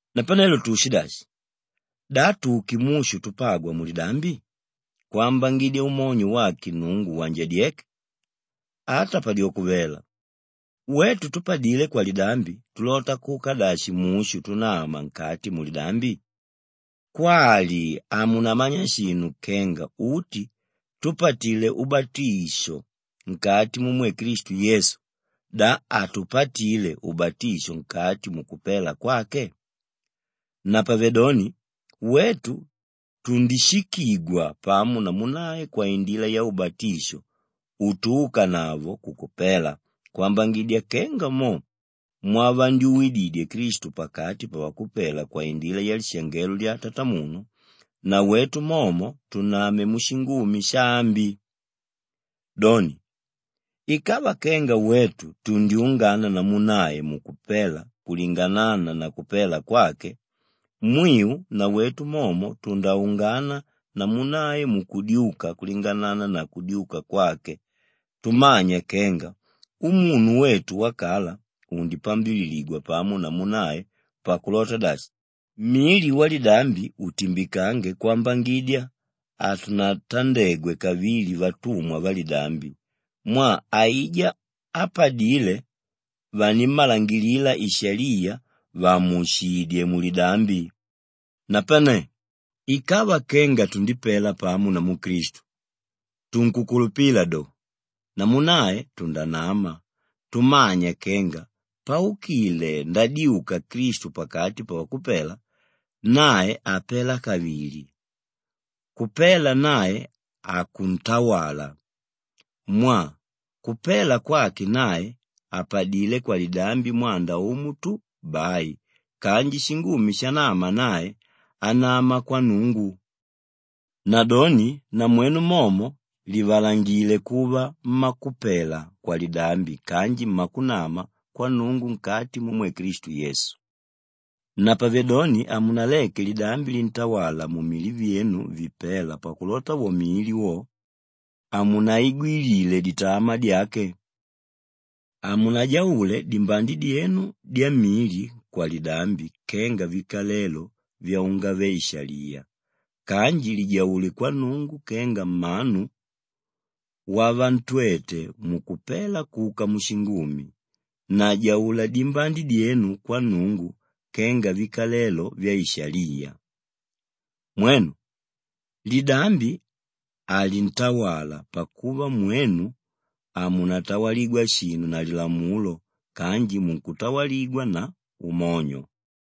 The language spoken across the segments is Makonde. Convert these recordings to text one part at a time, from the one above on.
Napanelo tuushidashi? Da tuke mushu tupagwa mulidambi kwambangidya umonyo wake Nnungu wanjadyeke? Ata padyoko vela! Wetu túpadile kwalidambi tulota kuka dashi mushu tunama nkati mulidambi? Kwali hamunamanya shinu kenga uti túpatile ubatisho nkati mumwe Klistu Yesu, da hatupatile ubatisho nkati mukupela kwake? Napavedoni wetu tundishikigwa pamo namu nae kwaindila yaubatisho utuukanavo kukupela kwambangidya kenga mo mwavandyuwididye Klistu pakati pavakupela kwaindila yalishangelo lya Tatamunu, nawetu momo tuname mushingumi shaambi. Doni, ikava kenga wetu tundyungana namu nae mukupela kulinganána na kupela kwake, mwiu nawetu momo tundaungana namu nae mukudyuka kulinganána na kudyuka kwake tumanya kenga umunu wetu wakala undipambililigwa pamo namu nae pakulota dashi, mili walidambi utimbikange kwambangidya hatunatandegwe kavili vatumwa validambi mwaa aijá ápadile vanimmalangilila ishaliya vàmuushidye mulidambi. Napane ikava kenga tundipela pamo namu Klistu, tunkukulupila do, namu nae tundanama tumanya kenga paukile ndadyuka Klistu pakati pavakupela, nae hapela kavili; kupela nae hakuntawala. Mwaa kupela kwake nae, apadilé kwalidambi mwanda umo tu bai kanji shingumi shanama nae, anama kwa Nnungu. Nadoni namwenu momo livalangile kuva mmakupela kwalidambi kanji mmakunama kwa Nnungu nkati mumwe Klistu Yesu. Napavedoni hamunaleke lidambi lintawala mumili vyenu vipéla pakulota wo mili wo, hamunaigwilile ditamaa dyake. Hamunajaule dimbande dyenu dyamili kwalidambi kenga vikalelo vyaungave-shaliya kanji lijaule kwa Nnungu kenga mmanu wavantwete mukupela kuka mushingumi na jaula dimbande dyenu kwa Nnungu kenga vikalelo vyaishaliya. Mwenu, lidambi halintawala pakuva mwenu hamunatawaligwa shinu na lilamulo kanji munkutawaligwa na umonyo.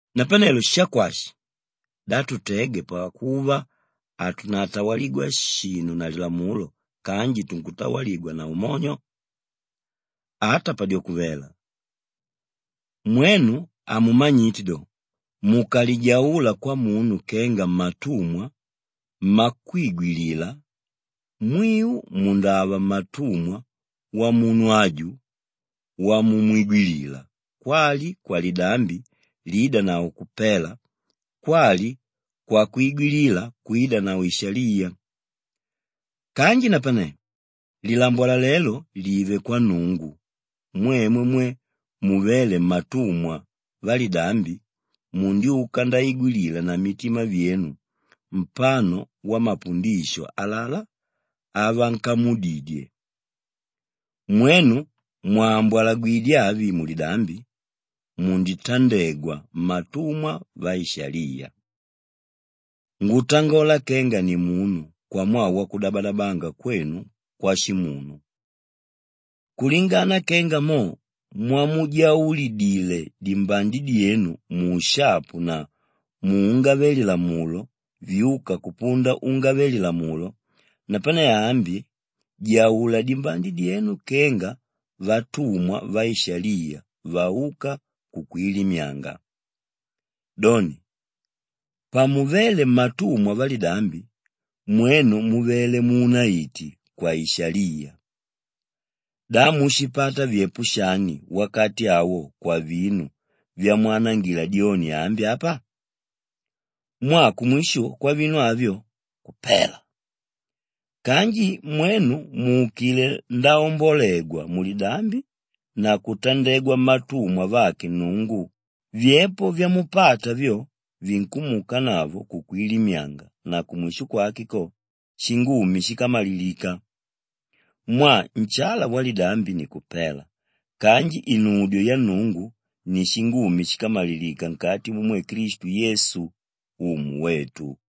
Napanelo shakwashi? Da tutege pakuva hatunatawaligwa shinu na lilamulo kanji tunkutawaligwa na umonyo? Ata padyoko vela! Mwenu hamumanyite do, mukalijaula kwamunu kenga mmatumwa mmakwigwilila, mwiu mundava mmatumwa wamunu aju wamumwigwilila kwali kwalidambi liidanavo kupela kwali kwakwigwilila kwidanavo ishaliya. Kanji napane lilambwalalelo live kwa Nnungu, mwemwe mwe muvéle mmatumwa validambi mundyuka ndaigwilila na mitima vyenu mpano wamapundisho alalá avankamudidye. Mwenu mwàmbwalagwidye avi mulidambi, munditandegwa mmatumwa vaishaliya. Ngutangola kenga nimunu kwamwaa wakudabadabanga kwenu kwashimunu. Kulingana kenga mo mwamujaulidile dimbande dyenu muushapu na muungave-lilamulo vyuka kupunda ungave-lilamulo napane ambi jaula dimbande dyenu kenga vatumwa vaishaliya vauka kukwilimyanga. Doni, pamuvéle mmatumwa validambi, mwenu muvele muunaiti kwaishaliya. Da mushipata vyepo shani wakati awo kwavinu vyamwanangila dyoni ambi apa? Mwaa kumwisho kwavinu avyo, kupela. Kanji napane mwenu múukile ndaombolegwa mulidambi na kutandegwa mmatumwa vake Nnungu, vyepo vyamupata vyo vinkumuukanavo kukwilimyanga na kumwisho kwake ko, shingumi shíkamalilika. Mwaa nshala walidambi ni kupela kanji inudyo ya Nnungu ni shingumi shíkamalilika nkati mumwe Klistu Yesu Umu wetu.